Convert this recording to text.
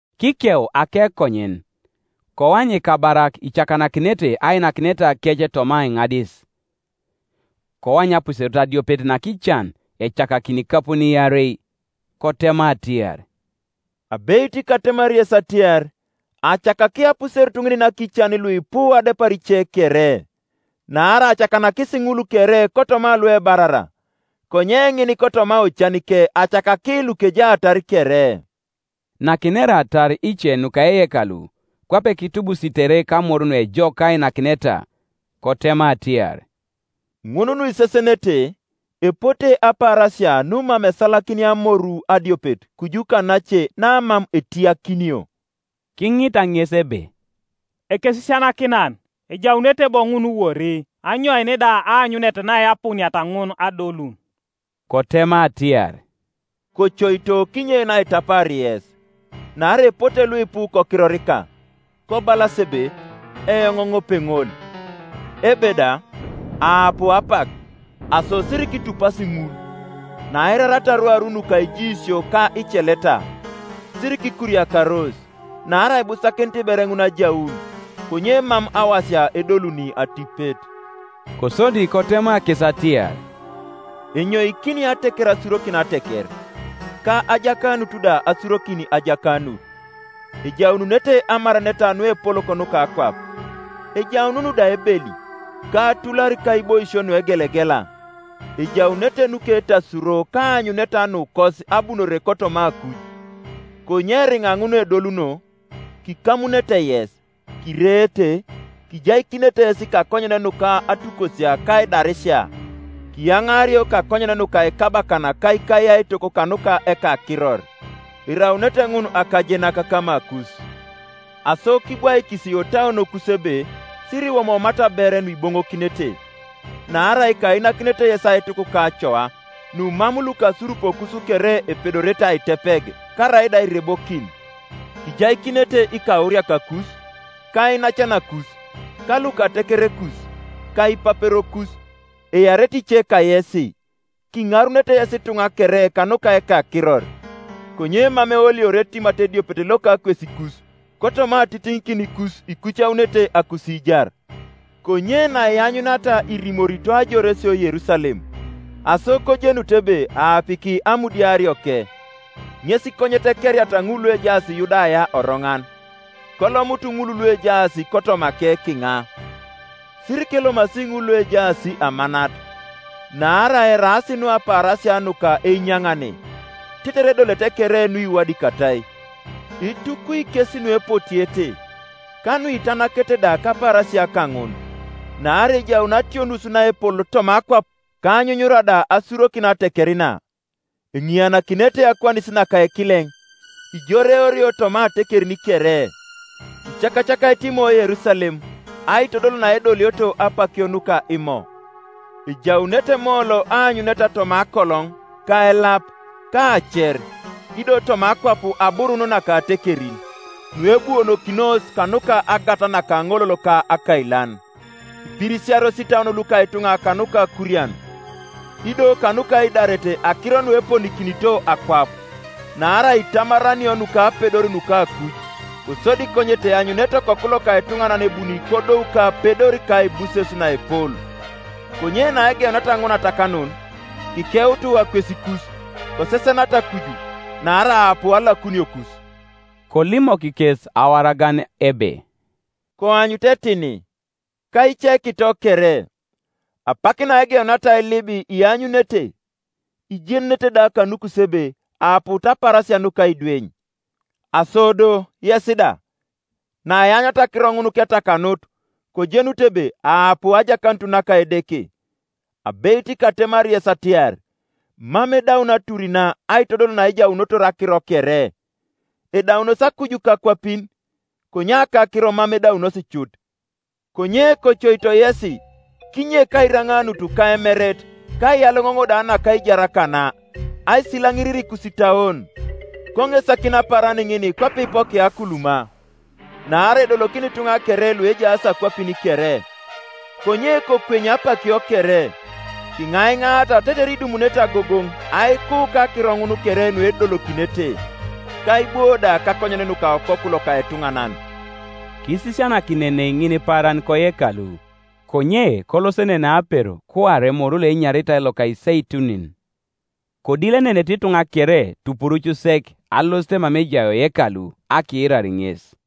Kikeu akekonyen, koany ikabarak icakanakinete ainakinetakec toma aiŋadis, Koany apuserut adiopet nakican ecakakini ikapun iarei. Kotema atiar, “Abeit katemari yes atiar, acakaki apuserut ŋin nakican luipu adepar ice kere: Naarai acakanakis ŋul kere kotoma luebarara, konye ŋin kotoma ocanike acakaki lukejaatar kere.” Nakineratar ice nuka eyekalu, kwape kitubusitere kamor nuejok ka ainakineta, kotema atiar, “Ŋun nuisesenete, epote apaarasia numam esalakinia amoru adiopet kuju kanace namam etiyakinio.” Kiŋita ŋes ebe, “Ekesisianakinan, ejaunete bo ŋun wori? Anyoin da aanyunet naeapuuniata ŋun adolun?” Kotema atiar, “Kocoito kinyein aitapaar yes; naarai epote luipu kokirorika, kobalas ebe, ‘Eoŋ ŋopeŋol!’ Ebe da, ‘Aapuu apak!’ Aso sirikitupasi ŋul. Naiirariata rwaru nuka ijiisio ka iceleta, sirikikuriakaros, naarai ibusakinit ber ŋun ajaun, konye mam awasia edoluni atipet.” Kosodi kotema kes atiar, “Enyoikini ateker asurokin ateker, ka ajakanut da asurokin ajakanut. Ejaununete amaraneta nuepolok nuka akwap, ejaunun da ebeli, ka atular kaiboisio nuegelegela; ejaunete nuketasuro ka aanyuneta nukos abunore kotoma akui. Konye eriŋa ŋun edoluno, kikamunete yes, kireete, kijaikinete yes kakonyen nuka atukosia ka aidarisia, kiyaŋaario kakonyen nuka ikabakan ka ikayaitok kanuka ekakiror. Eraunete ŋun akajenak kamakus. Aso kibwaikisi otauonokus ebe sirikiwomoomata ber nuiboŋokinete; naarai kainakinete yes aituk ka acoa, numam lukasurupokus kere epedorete aitepeg karaida airebokin. Kijaikinete ikauriakakus, ka iinacanakus, ka lukatekerekus, ka ipaperokus, earete ice kayesi; kiŋarunete yes ituŋa kere kanuka ekakiror. Konye mam eoliori etimat ediopet loka akwesikus. Kotoma atitiŋikinikus ikucaunete akusiijar. “Konye naianyuniata irimorito ajoresio Yerusalem, aso kojenut ebe aapiki amudiarioke. Ŋes konyet ekeriata ŋul luejaas Yudaya oroŋan, kolomutu ŋul luejaas kotomake kiŋa, sirikelomasi ŋul luejaas amanat; naarai eraas nu apaarasia nuka einyaŋane, tetere edolete kere nuiwadikatai. Itukwi kes nuepotiete, ka nuitanakete da kapaarasia kaŋun! Naarai ejaun ationus naepol toma akwap, ka anyunyura da asurokin ateker na. Eŋianakinere akwanis naka ekileŋ, ijoreorio toma atekerin kere; icakacakaete Imo Yerusalem, aitodol naedolioto apakio nuka Imo. Ejaunete moolo aanyuneta toma akoloŋ ka elap ka aacer, ido toma akwap aburun naka atekerin, nuebuonokinos kanuka agat naka aŋolol ka akailan; ipirisiaros itauon luka ituŋa kanuka akurian, ido kanuka aidaret akiro nueponikinito akwap: naarai itamaranio nukapedor nuka akuj. Kosodi konyet eanyunete Okoku loka etuŋanan ebuni kodou kapedor ka aibuses naepol. Konye naegeuniata ŋun atakanun, kikeutu akwesikus, kosesenata kuju, naarai aapu alakuniokus.” Kolimok kes awaragan ebe, “Koanyutu etini, ka icekito kere. Apak naegeuniata ailib, ianyunete, ijenunete da kanukus ebe aaput apaarasia nuka aidweny, Aso do, yes da, naianyuniata akiro ŋun ketakanut, kojenutu ebe aapu ajakanut naka Edeke. Abeit katemari yes atiar, Mam edaun atur na, aitodol naejaunotor akiro kere. Edaunos akuj ka akwapin; konye akakiro mam edaunos cut. “Konye kocoito yesi kinyek airaŋanut ka emeret ka aiyaloŋoŋ da naka aijar kana aisilaŋirir ikusitauon, konesakin apaaran ŋin kwape ipokia akuluma. Naarai edolokini ituŋa kere luejaas akwapin kere. Konye kokwenya apakio kere, kiŋaiŋaata tetere idumunete agogoŋ aiku kakiro ŋun kere nuedolokinete, ka aibwo da kakonyen nuka Okoku loka etuŋanan.” Kisisianakinenei ŋinipaaran koyekalu, konye kolosenenei apero kuare moru loenyaritai loka Iseitunin. Kodilenenete ituŋa kere tupuruc sek alosit mama ejai oyekalu akiirar ŋes.